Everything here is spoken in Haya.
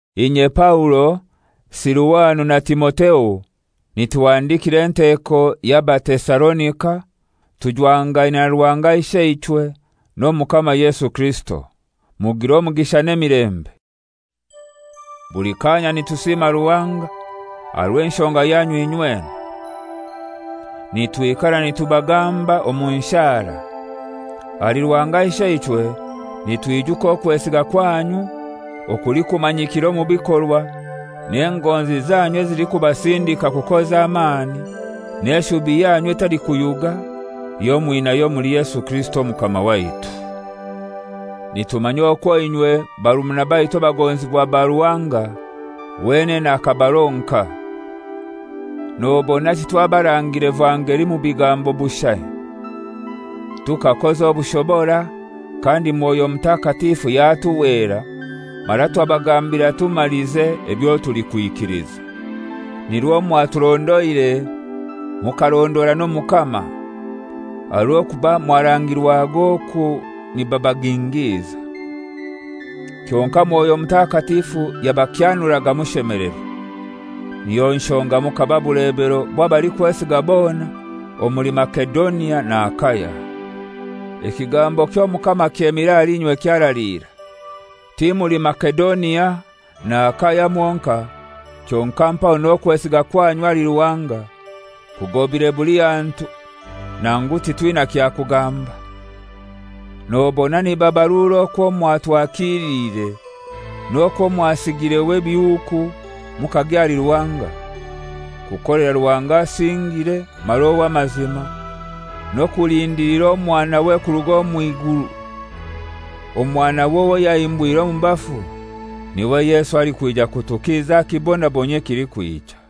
Inye Paulo, Siluwano na Timotheo, nituhandikira enteko y'Abatesalonika tujwangaine na Ruhanga Isheichwe n'Omukama Yesu Kirisito: Mugire omugisha n'emilembe. Buli kanya nitusima Ruhanga aha rw'enshonga yanyu inywena. Nitwikara nitubagamba omu nshara. Ahali Ruhanga Isheichwe nitwijuka okwesiga kwanyu okulikumanyikira omu bikorwa, n'engonzi zanyu ezilikubasindika kukoza amani, n'eshubi yanyu etalikuyuga eyo mwinayo omuli Yesu Kirisito Omukama waitu. Nitumanya okwo inywe, barumuna baitu abagonzibwa ba Ruhanga, wenene akabaronka. Nobona titwabarangiire vangeli mu bigambo bushai. Tukakoza obushobora, kandi Mwoyo Mutakatifu yatuhwera mara twabagambira tumalize ebyo tulikwikiliza. Nirwo mwaturondoire, mukarondora n'Omukama, aha rw'okuba mwarangirwaga oku nibabagingiiza. Kyonkai Mwoyo Mutakatifu yabakyanuraga mushemelerwa. Niyo nshonga mukaba bulebero bw'abalikwesiga bona omuli Masedonia na Akaya. Ekigambo ky'Omukama kyemire ahali inywe kyaraliira, ti muli Masedonia na Akaya mwonkai, kyonkai mpaho n'okwesiga kwanyu ahali Ruhanga kugobire buli hantu nangu titwina kyakugamba. Nobona nibabarura okwo mwatwakiiliire, n'okwo mwasigireho ebihuuku mukagya ahali Ruhanga, kukolera Ruhanga asingire mara ow'amazima, n'okulindilira Omwanawe kuruga omw'iguru, Omwanawe owo yahimbwire omu bafu, niwe Yesu alikwija kutukiza aha kibonabonyio ekilikwija.